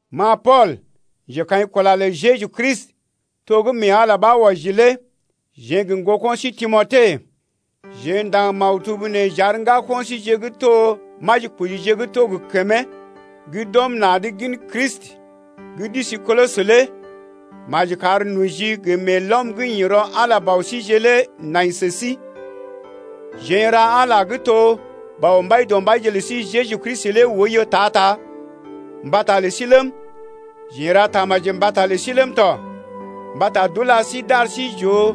Ma Pool, njekaḭkula lə Jeju Kristi, to gə́ mee Ala ɓa wɔji lé jeḛ gə ŋgoko̰ sí Timote jeḛ ndaŋg maktub nee j’ar ŋgako̰ síje gə́ to majikojije gə́ to gə kəmee gə́ d’ɔm na̰’d gin Kristi gə́ d’isi Kolosə lé. Maji kar noji gə meelɔm gə́ ḭ rɔ Ala Bɔ síje lé nai sə sí ya. Jeḛ n’ra Ala gə́ to Bɔ Mbaidɔmbaije lə sí Jeju Kristi lé oiyo ta-ta mbata lə sí ləm, jeḛ n’ra tamaji mbata lə sí ləm tɔ mbata d’ula sí d’ar sí j’oo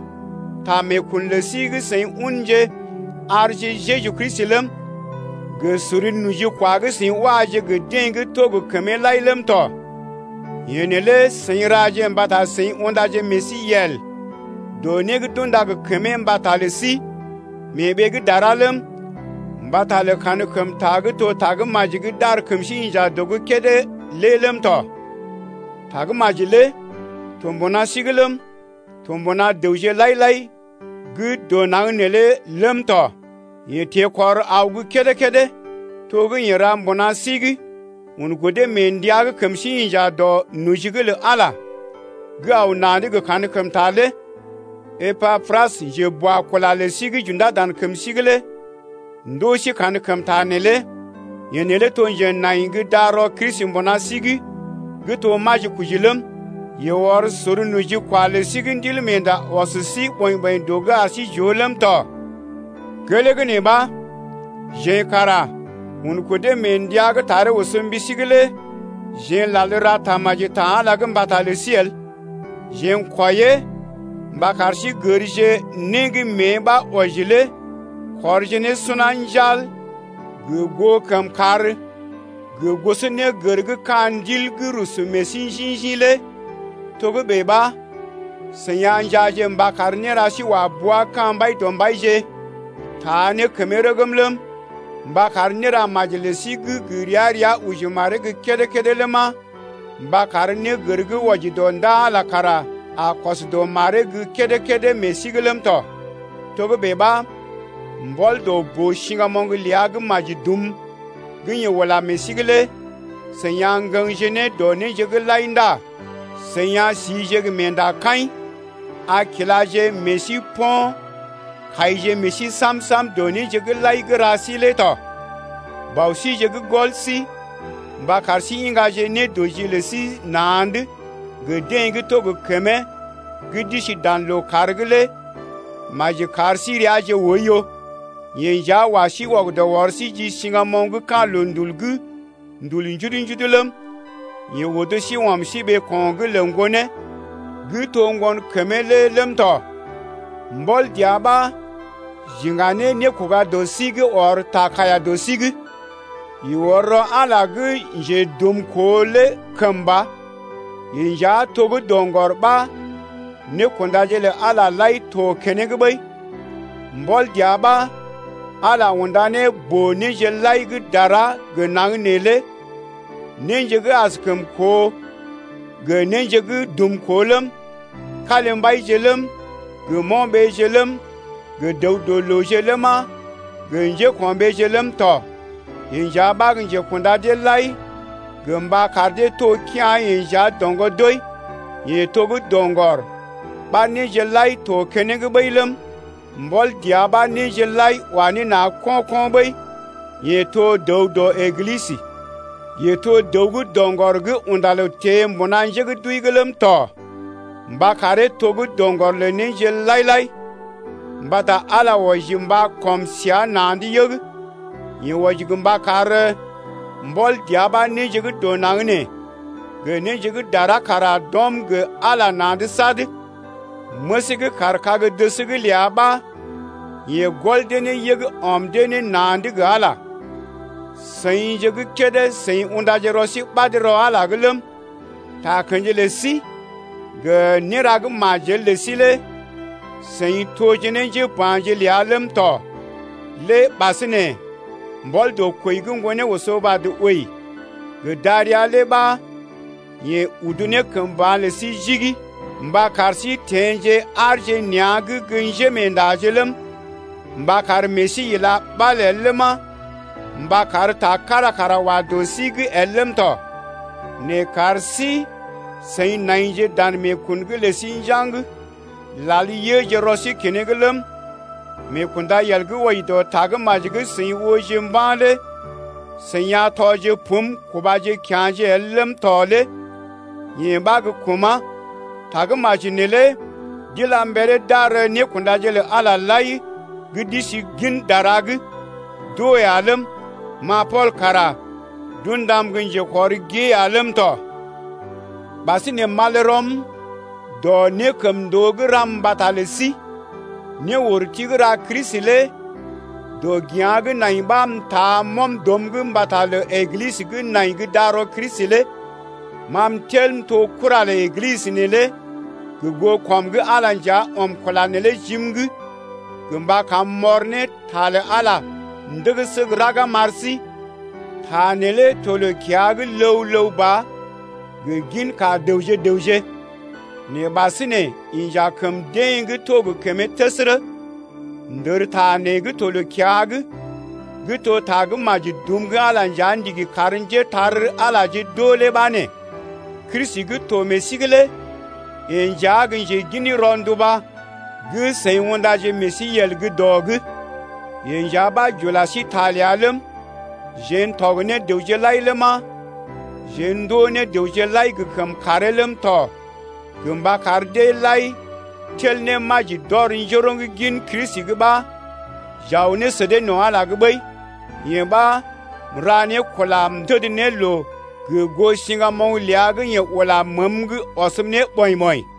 ta meekun lə sí gə́ seḭ unje arje Jeju Kristi ləm, gə sor nojikwa gə́ seḭ waje gə deḛ gə́ to gə kəmee lai ləm tɔ. Yee neelé seḭ raje mbata seḭ undaje meḛ sí yel dɔ né gə́ d’unda gə kəmee mbata lə sí mee ɓee gə́ dara ləm, mbata lə kankəmta gə́ to Tagə́maji gə́ d’ar kəm sí inja dɔ’g kédé lé ləm tɔ. Tagə́maji lé to mbuna sí’g ləm, to mbuna dəwje lai-lai gə́ dɔ naŋg neelé ləm tɔ, yee teḛkɔr aw gə́ kédé-kédé to gə́ yeḛ ra mbuna sí’g un kudee mee ndəa gə́ kəm sí inja dɔ noji’g lə Ala gə́ aw na̰’d gə kankəmta lé. Epapras, njeboakula lə sí gə́ j’undá dan kəm sí’g lé ndoo sí kankəmta neelé. Yeḛ lé to njenai gə́ darɔ Kristi mbuna sí’g gə́ to majikoji ləm yeḛ ɔr sor nojikwa lə sí gə́ Ndilmeenda ɔs sí ɓɔḭ-ɓɔḭ dɔ’g ar sí j’oo ləm tɔ. Gelee nee ɓa, jeḛ kara un kudee mee ndəa gə́ taree oso mbi sí’g lé jeḛ n’lal ra tamaji ta Ala’g lé mbata lə sí el. Jeḛ n’kwɔiee mba kar sí gərje né gə́ mée ɓa wɔji lé kɔrje ne suna njal gə goo kəmkàr gə gosonégər gə́ ka̰ ndil gə́ rusu meḛ sí njḭ-njḭ lé. Togə́bè ɓa, seḭ a njaaje mba kar néra sí wa bua ka̰ Mbaidɔmbaije taa ne kəmee rəgm ləm, mba kar néra maji lə sí gə́ gə ria-ria oji maree gə́ kédé-kédé ləma, mba kar négər gə́ wɔji dɔ ndaa Ala kara a kɔs dɔ maree’g gə́ kédé-kédé meḛ sí’g ləm tɔ. Togə́bè ɓa, mbɔl dɔ boo-siŋgamoŋ ləa gə́ maji dum gə́ yeḛ ula meḛ sí’g lé seḭ a ŋgəŋje ne dɔ néje’g lai ndá seḭ a sije gə meendakaḭ, a kilaje meḛ sí po̰ kaije meḛ sí sam-sam dɔ néje gə́ lai gə́ ra sí lé tɔ. Bɔ síje gə́ gɔl sí mba kar sí iŋgaje nédɔji lə sí na̰’d gə deḛ gə́ to gə kəmee gə́ d’isi dan lookàr’g lé maji kar sí reaje oiyo. Yeḛ nja wa sí wɔgədɔ ɔr sí ji siŋgamoŋ ka̰ loondul gə́ ndul njudu-njudu ləm, yeḛ odo sí ɔm sí ɓeeko̰’g lə Ŋgonee gə́ to ŋgonkəmee lé ləm tɔ. Mbɔl dəa ɓa j’iŋga ne nékoga dɔ sí gə́ ɔr ta kaiya dɔ sí’g. Yeḛ ɔr rɔ Ala gə́ njedumkoo lé kəmba, yeḛ nja to gə́ doŋgɔr ɓa nékundaje lə Ala lai to keneŋ ɓəi. Mbɔl dəa ɓa Ala unda ne boo-néje lai gə́ dara gə naŋg nee lé néje gə́ askəm koo gə néje gə́ dumkoo ləm, kalimbaije ləm, gə mo̰ɓeje ləm, gə dəw-dɔ-looje ləma, gə njéko̰ɓeeje ləm tɔ. Yeḛ nja ɓa gə́ njekunda deḛ lai gə mba kar dee to kea̰ yeḛ nja doŋgɔ doi. Yeḛ to gə́ doŋgɔr ɓa néje lai to keneŋ ɓəi ləm, mbɔl dəa ɓa néje lai d’wa ne na̰ ko̰-ko̰ ɓəi. Yeḛ to gə́ dəw dɔ Eglisə, yeḛ to doŋgɔr ləm, yeḛ to dəw gə́ doŋgɔr gə́ unda loo teḛ mbuna njé gə́ d’wəi’g ləm tɔ mba karee to gə́ doŋgɔr lə néje lai-lai. Mbata Ala wɔji mba kɔm səa na̰’d yəg. Yeḛ wɔji mba kar mbɔl dəa ɓa néje gə́ dɔ naŋg nee gə néje gə́ dara kara d’ɔm gə Ala na̰’d sad. Məsee gə́ kaar kag-dəs’g ləa ɓa yeḛ gɔl dee ne yəg ɔm dee ne na̰’d gə Ala ya. Seḭje gə́ kédé seḭ undaje rɔ sí ɓad rɔ Ala’g ləm, takə̰ji lə sí gə néra gə́ majel lə sí lé seḭ toje ne njéba̰je ləa ləm tɔ lé ɓasinè mbɔl dɔ kwəi gə́ ŋgonee oso vad wəi gə darəa lé ɓa yeḛ udu ne kəm ba̰ lə sí jigi, mba kar sí teḛje aarje nea̰’g gə́ njémeendaje ləm, mba meḛ sí ila ɓal el ləma, mba kar ta kára kara wa dɔ sí’g el ləm tɔ. Nɛ kar sí-seḭ naije dan meekun’g lə sí njaŋg, lal yəje rɔ sí keneŋ ləm, meekundayel gə́ wɔji dɔ Tagə́maji gə́ seḭ ooje mba̰ lé seḭ a tɔje pum kubaje kya̰je el ləm tɔ lé yee ɓa gə́ kuma̰. Tagə́maji neelé d’ila mberee d’ar nékundaje lə Ala lai gə́ d’isi gin dara’g d’oo ya ləm, ma Pool kara d’undam gə́ njekɔrgoo gée ya ləm tɔ. Ɓasinè m’al rɔm wɔji dɔ nékəmndoo gə́ ram mbata lə sí. Néurti gə́ ra Kristi lé dɔgea̰ gə́ nai ɓa m’taa m’ɔm dɔm’g mbata lə Eglisə gə́ nai gə́ darɔ Kristi lé. Ma m’tel m’to kura lə Eglisə neelé gə goo kɔm gə́ Ala nja ɔm kula neelé jim’g gə mba kam m’ɔr ne ta lə Ala ndəgəsə gə́ raga m’ar sí. Ta neelé to loo-kiya’g ləw-ləw ba gə ginka dəwje-dəwje, nɛ ɓasinè inja kəm deḛ gə́ to gə kəmee təsərə. Ndərta nee gə́ to loo-kiya’g gə́ to ta gə́ maji dum gə́ Ala nja ndigi kar njépole-magəje d’oo lé ɓa nee: Kristi gə́ to meḛ sí’g lé yeḛ nja gə́ njegin rɔnduba gə́ seḭ undaje meḛ sí yel gə́ dɔ’g. Yeḛ nja ɓa j’ula sí ta ləa ləm, jeḛ n’tɔg ne dəwje lai ləma, jeḛ ndoo ne dəwje lai gə kəmkàree ləm tɔ gə mba kar deḛ lai tel ne maji d’ɔr njoroŋ gin Kristi’g ɓa j’aw ne sə dee no̰ Ala’g ɓəi. Yee ɓa, m’ra ne kula m’təd ne loo, gə goo siŋgamoŋ ləa gə́ yeḛ ula məəm’g ɔsm ne ɓɔḭ-ɓɔḭ.